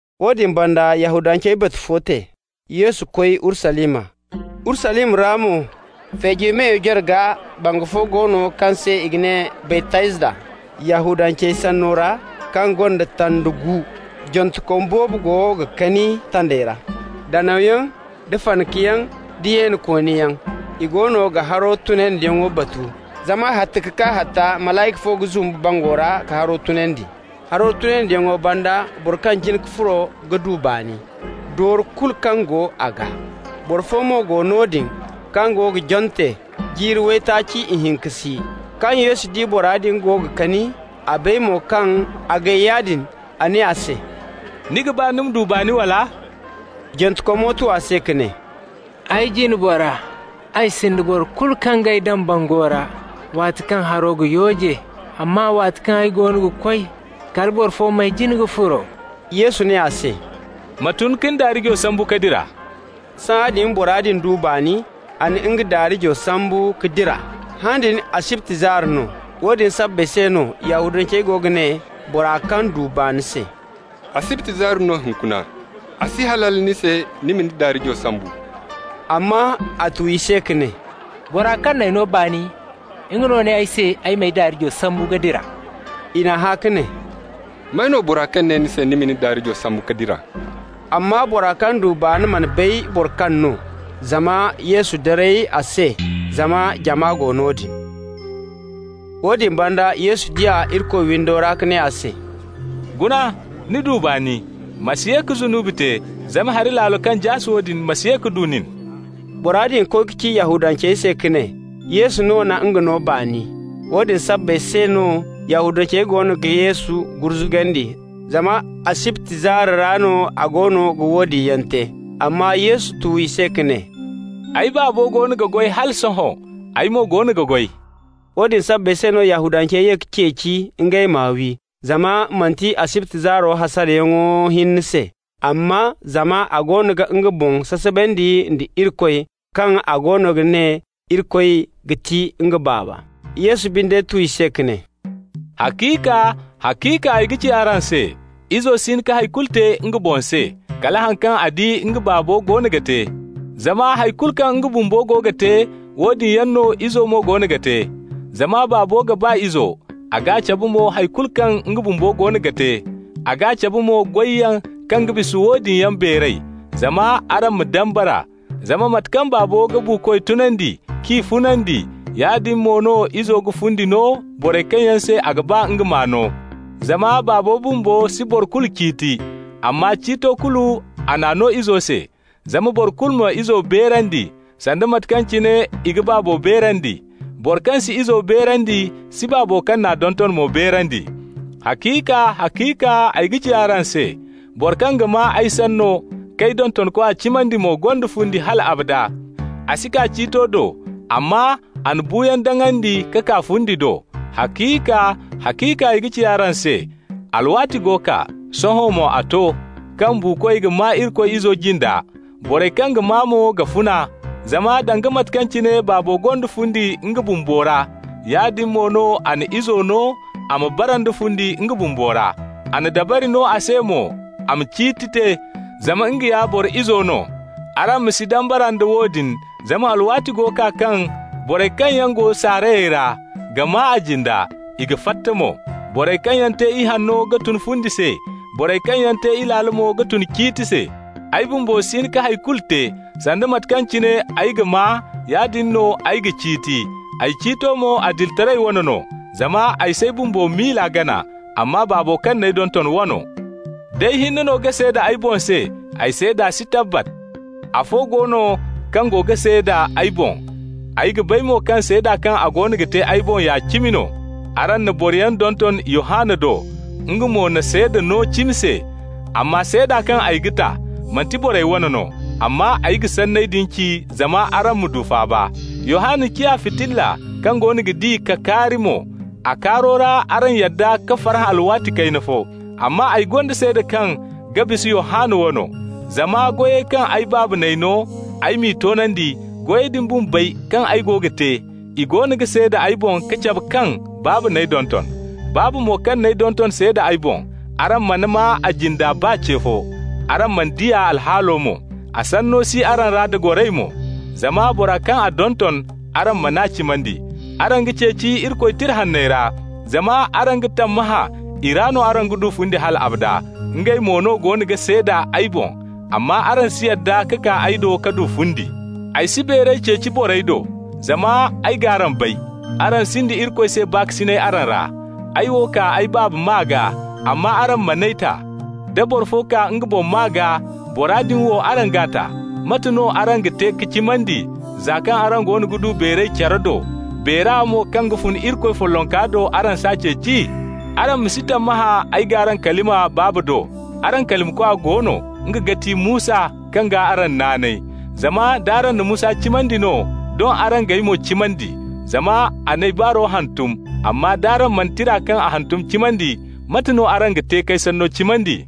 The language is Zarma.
Woodin banda Yahudancey batu fo te. Yesu koy Urusalima. Urusalima ra mo Feejey Meyo jarga bangu fo go no kaŋ se i ga ne Baytazda Yahudancey sanney ra, kaŋ gonda tanda gu. Jantekom boobo goono ga kani tandey ra -- danawyaŋ, da fanakayaŋ, da yeenikooniyaŋ. I goono ga haro tunandiyaŋo batu, zama hatta ka kaa hatta malayka fo ga zumbu bango ra ka haro tunandi. Haro tunandiyaŋo banda boro kaŋ jin ka furo ga du baani, doori kulu kaŋ go a gaa. Boro fo mo go noodin kaŋ go ga jante jiiri waytaaci ihinka si. Kaŋ Yesu di bora din go ga kani, a bay mo kaŋ a gay yaadin, a ne a se: «Ni ga ba ni ma du baani, wala?» Jantekomo tu a se ka ne: «Ay jine bora, ay sinda boro kulu kaŋ g'ay daŋ bango ra waati kaŋ haro ga yooje, amma waati kaŋ ay goono ga koy, kala boro fo m'ay jin ka furo.» Yesu ne a se: «Ma tun ka ni daarijo sambu ka dira.» Sahãadin bora din du baani, a na nga daarijo sambu ka dira. Han din asibti zaari no. Woodin sabbay se no Yahudancey go ga ne bora kaŋ du baani se: «Asibti zaari no hunkuna. A si halal ni se ni ma ni daarijo sambu.» Amma a tu i se ka ne: «Bora kaŋ n'ay no baani, nga no ne ay se ay m'ay daarijo sambu ka dira.» I n'a hã ka ne: «May no, bora kaŋ ne ni se ni ma ni daarijo sambu ka dira?» Amma bora kaŋ du baani mana bay boro kaŋ no, zama Yesu daray a se zama jama go noodin. Woodin banda Yesu di a Irikoy windo ra ka ne a se: «Guna, ni du baani. Ma si ye ka zunubi te zama hari laalo kaŋ jaase woodin ma si ye ka du nin.» Bora din koy ka ci Yahudancey se ka ne Yesu no na nga no baani. Woodin sabbay se no Yahudancey goono ga Yesu gurzugandi zama asibti zaari ra no a goono ga woodin yaŋ te. Amma Yesu tu i se ka ne: «Ay Baabo goono ga goy hala sohõ, ay mo goono ga goy.» Woodin sabbay se no Yahudancey ye ka ceeci ngey m'a wi, zama manti asibti zaaro hasarayaŋo hinne se, amma zama a goono ga nga boŋ sasabandi nda Irikoy, kaŋ a goono ga ne Irikoy ga ti nga Baaba. Yesu binde tu i se ka ne: «Haciika, haciika ay ga ci araŋ se: Izo si hin ka hay kulu te nga boŋ se, kala haŋ kaŋ a di nga Baabo goono ga te. Zama hay kulu kaŋ nga bumbo go ga te, woodin yaŋ no Izo mo goono ga te. Zama Baabo ga ba Izo, a g'a cabe mo hay kulu kaŋ nga bumbo goono ga te. A g'a cabe mo goyyaŋ kaŋ ga bisa woodin yaŋ beeray, zama araŋ ma dambara. Zama mate kaŋ Baabo ga buukoy tunandi k'i funandi, yaadin mo no Izo ga fundi no borey kaŋ se a ga ba nga m'a no. Zama Baabo bumbo si boro kulu ciiti, amma ciito kulu a n'a no Izo se, zama boro kulu ma Izo beerandi, sanda mate kaŋ cine i ga Baabo beerandi. Boro kaŋ si Izo beerandi si Baabo kaŋ n'a donton mo beerandi. Haciika, haciika ay ga ci araŋ se: boro kaŋ ga maa ay sanno k'ay dontonkwa cimandi mo gonda fundi hal abada. A si kaa ciito do, amma a na buuyaŋ daŋandi ka kaa fundi do. Haciika, haciika ay ga ci araŋ se: alwaati go kaa, sohõ mo a to, kaŋ buukoy ga maa Irikoy Izo jinda, borey kaŋ ga maa mo ga funa. Zama danga mate kaŋ cine Baabo gonda fundi nga bumbo ra, yaadin mo no a na Izo no a ma bara nda fundi nga bumbo ra. A na dabari no a se mo a ma ciiti te, zama nga ya Boro Izo no. Araŋ ma si dambara nda woodin, zama alwaati go kaa kaŋ borey kaŋ yaŋ go saarayey ra ga maa a jinda. I ga fatta mo. Borey kaŋ yaŋ te ihanno ga tun fundi se. Borey kaŋ yaŋ te ilaalo mo ga tun ciiti se. Ay bumbo si hin ka hay kulu te. Sanda mate kaŋ cine ay ga maa, yaadin no ay ga ciiti. Ay ciito mo adilitaray wane no, zama ay s'ay bumbo miila gana, amma Baabo kaŋ n'ay donton wano. D'ay hinne no ga seeda ay boŋ se, ay seeda si tabbat. Afo go no kaŋ go ga seeda ay boŋ, ay ga bay mo kaŋ seeda kaŋ a goono ga te ay boŋ ya cimi no. Araŋ na boroyaŋ donton Yohanna do, nga mo na seeda no cimo se. Amma seeda kaŋ ay ga ta, manti borey wane no, amma ay ga sanney din ci zama araŋ ma du faaba. Yohanna ciya fitilla kaŋ goono ga di ka kaari mo, a kaaro ra araŋ yadda ka farhã alwaati kayna fo. Amma ay gonda seeda kaŋ ga bisa Yohanna wano. Zama goyey kaŋ ay Baaba n'ay no ay m'i toonandi, goyey din bumbey kaŋ ay go ga te, i goono ga seeda ay boŋ ka cabe kaŋ Baaba n'ay donton. Baaba mo kaŋ n'ay donton seeda ay boŋ. Araŋ mana maa a jinde baa ce fo, araŋ mana di a alhaalo mo. A sanno si araŋ ra da goray mo, zama bora kaŋ a donton, araŋ man'a cimandi. Araŋ ga ceeci Irikoy Tira Hanney ra, zama araŋ ga tammahã i ra no araŋ ga du fundi hal abada, ngey mo no goono ga seeda ay boŋ. Amma araŋ si yadda ka kaa ay do ka du fundi. Ay si beeray ceeci borey do, zama ay g'araŋ bay. Araŋ sinda Irikoy se baakasinay araŋ ra. Ay wo kaa ay Baaba maa gaa, amma araŋ man'ay ta. Da boro fo kaa nga boŋ maa gaa, bora din wo araŋ g'a ta. Mate no araŋ ga te ka cimandi, za kaŋ araŋ goono ga du beeray care do, beera mo kaŋ ga fun Irikoy follonka do, araŋ s'a ceeci? Araŋ ma si tammahã ay g'araŋ kalima Baaba do. Araŋ kalimakwa go no, nga ga ti Musa kaŋ gaa araŋ naanay. Zama nd'araŋ na Musa cimandi no, doŋ araŋ g'ay mo cimandi, zama a n'ay baaro hantum. Amma d'araŋ mana tira kaŋ a hantum cimandi, mate no araŋ ga te k'ay sanno cimandi?»